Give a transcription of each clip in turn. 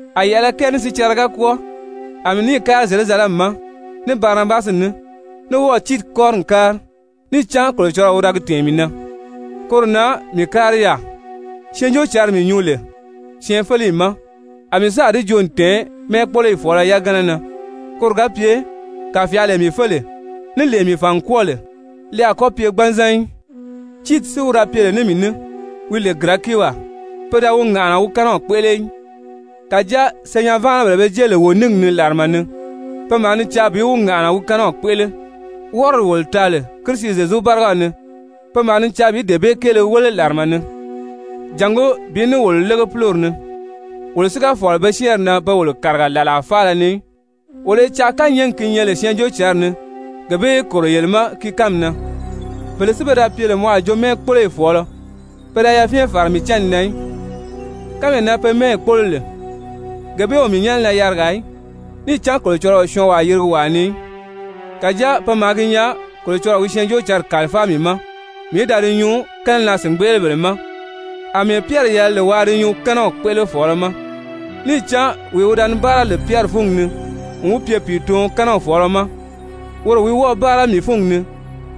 A yɛ̀ʔɛlɛ kɛɛ ní sicɛrɛ ga kwɔ́ɔ, a mii níì kári Zyerusalɛmi ma ní Barinabasi ní, ní wɔ́ɔ̀ Tiiti kɔ́ri n kári. Níì cán Kolocɔlɔɔ wi da gi tɛ̀ɛn mii na, koro na mii kári yaà. Syɛɛnjóocǎnri mii nyuu lè syɛɛnfeleyi ma a mii sáà di joo n tɛ̀ɛn mɛ́ɛkpoloyi fɔ̀ɔlɔ yagana na koro ga pye kàfyaalee mii fé lè, ní lee mii fàn n kwɔ́ɔ lè li a kɔ́ pye gbanzan í. Tiiti si wi da pye lè ní mii ní, wi lè Girɛkiwaa, pe da wi ŋàʔana wi kɛ́nɛw kpéʔele í. Kàjáa senyɛn-váanabèle be jée lè wo níngi ni làrama ni, pe maa ni caa bi wi ŋàʔana wi kɛ́nɛw kpéʔele, wɔ́rɔdi wolo taa lè Kirisi Zyezu bárigaw ni, pe maa ni caa bi dee bee kéele wéle làrama ni jàngó bi ní wolo lége púlori ni. Wolo si ga fɔ̀lɔ pe syɛ́ɛnri na pe wolo kàriga làlaa faala ni í, wolo i caa kányɛɛgi ki nyɛ lè Syɛɛnjóocǎnri ni, gee bee í kòro yele ma gi kánmi na. Bele si pe da pye lè mɔ a jo mɛ́ɛkpoloyi fɔ̀ɔlɔ, pe da yafyɛn fàra mii cánni na í, kánmee na pe mɛ́ɛyi kpólo lè, gee bee o mii nyɛ́nɛ na yarigaa í! Níì cán Kolocɔlɔɔ o syɔɔnwaa yirigi wàa ni í. Kàjáa pe maa gi nyaa Kolocɔlɔɔ wi Syɛɛnjóocǎnri kàlifáa mii ma mii í da di nyuu kɛ́nɛnaa-sìngbeʔelebèle ma, àmɛɛ Pyɛri yɛlɛ lè waa di nyuu kɛ́nɛw kpéʔelefɔɔlɔ ma. Níì cán wee wi da ni báara lè Pyɛri fúngi ni n wi pye pìituɔn kɛ́nɛw fɔ̀ɔlɔ ma, woro wi wɔ́ɔ̀ báara mii fúngi ni,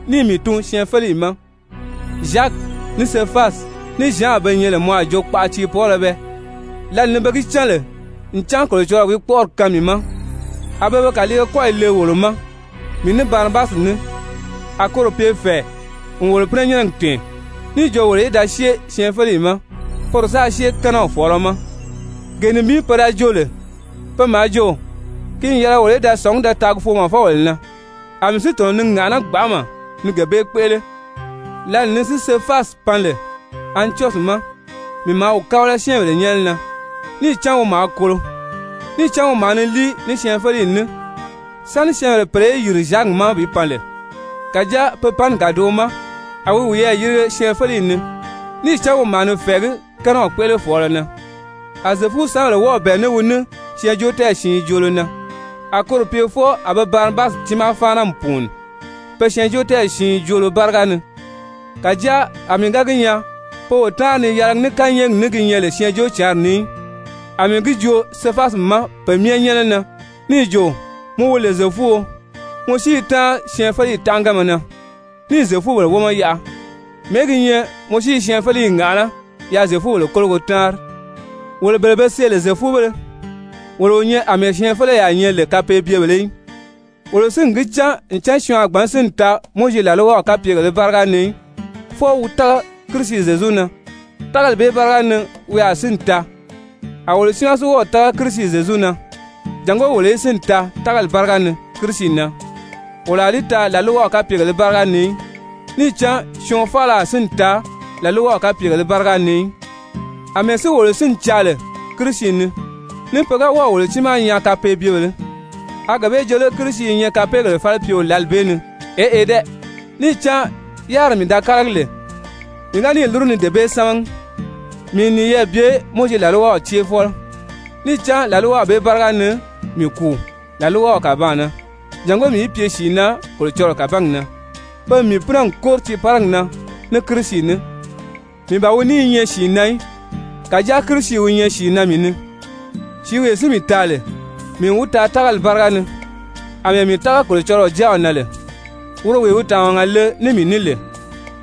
níì mii tun syɛɛnfeleyi ma, Zyaki, ní Sefasi, ní Zyan be nyɛ lè mɔ a jo kpaʔa tiipɔɔlɔ bɛɛ, lǎli ni pe gi cán lè ncan Kolocɔlɔɔ wi kpɔ́ʔɔri kaan mii ma, a be be kàliige kɔ́yi le wolo ma, mii ní Barinabasi ní, a koro pye fɛ̀ɛ n wolo pínɛnyɛnnɛgi tɛ̀ɛn, níì jo wolo í da syée syɛɛnfeleyi ma, poro sáā syée kɛ́nɛw fɔ̀ɔlɔ ma. Gee nibin pe da joo lè, pe maa jo ki n yɛlɛ wolo í da sɔ̀ngí da taagi foomɔfɔbèle na, a mii si tɔ̀nɔ ni ŋàʔaná gbanʔama ni gee bee kpéʔele. Lǎli ni si Sefasi pan lè Antyɔsyi ma, mii maa wi kábala syɛ́ɛnbèle nyɛ́nɛ na níì cán wi maa kolo. Níì cán wi maa ni líi ní syɛɛnfeleyi ní sáni syɛ́ɛnbèle pèle í yìri Zyaki ma bi pan lè. Kàjáa pe panni kàdoʔo ma a wi wiyɛɛ yirige syɛɛnfeleyi ni, níì cán wi maa ni fɛ̀ɛgí kɛ́nɛw kpéʔelefɔɔlɔ na. A Zyefusanbèle wɔ́ɔ̀ bɛ̀ɛ ní wi ní syɛɛnjóotɛɛyi siin joolo na, a koro pye fwɔɔ a be Barinabasi tiimaa fáana n pùuni pe syɛɛnjóotɛɛyi siin joolo báriga ni. Kàjáa a mii ga gi nyaa pe o táanri ni yɛlɛgi ní kányɛɛgi ní ki nyɛ lè Syɛɛnjóocǎnri ni í, a mii gi joo Sefasi ma pe myɛ nyɛ́nɛ na níì jo: «Mɔ wi lè Zyefuo, mɔ si i táanri syɛɛnfeleyi tánʔaganma na níì Zyefubèle wómɔ yaʔa, mɛ̀ɛ́ gi nyɛ mɔ si i syɛɛnfeleyi ŋàʔaná yaa Zyefubèle kólogo táanri?» Wolo bele be see lè Zyefubéle, wolo o nyɛ àmɛɛ syɛɛnfeleyaa nyɛ lè kapeebyebèlē í. Wolo si n gi cán ncan syɔɔn a gbǎn sínni taa Mowizi làlwaw kapyegèlē báriga ni í, fwɔɔ wi tága Kirisi Zyezu na, tágali bee báriga ni wi a sínni taa, a wolo tiimaa si wɔ́ɔ̀ tága Kirisi Zyezu na jàngó wolo í sínni taa tágali báriga ni Kirisi na, wolo a li taa làlwaw kapyegèlē báriga ni í, níì cán syɔɔn faala a sínni taa làlwaw kapyegèlē báriga ni í. Amɛɛ si wolo sínni caa lè Kirisi ni, ní pe ga wɔ́ɔ̀ wolo tiimaa nyaa kapeebyebèlē, a gee bee joo lé Kirisi i nyɛ kapeegèle falipyeo lǎli bee ni? Eʔe dɛ! Níì cán yáriri mii da kálagi lè, mii ga níì lúru ni dee bee sámagi, mii n niyɛɛ bye Mowizi làlwaw céefɔlɔ. Níì cán làlwaw bee báriga ni mii kùu làlwaw kàbaan na, jàngó mii í pye sìi na Kolocɔlɔɔ kàbangi na. Pe n mii pínɛ n kóri tiiparigi na ní Kirisi ní. Mii ban wi ní i nyɛ sìi na í, kàjáa Kirisi wi nyɛ sìi na mii ni. Sìíwee si mii taa lè, mii n wi taa tágali báriga ni àmɛɛ mii tága Kolocɔlɔɔ Jáaw na lè, woro wee wi tàmaga le ní mii ní lè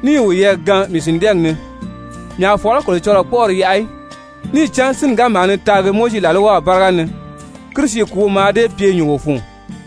níì wiyɛɛ gaan mii sìndɛɛgi ni. Mii a fɔ̀lɔ́ Kolocɔlɔɔ kpɔ́ʔɔri yaʔa í. Níì cán sínni ga maa ni taagi Mowizi làlwaw báriga ni, Kirisi kùúw mǎà dée pye nyùngo fun.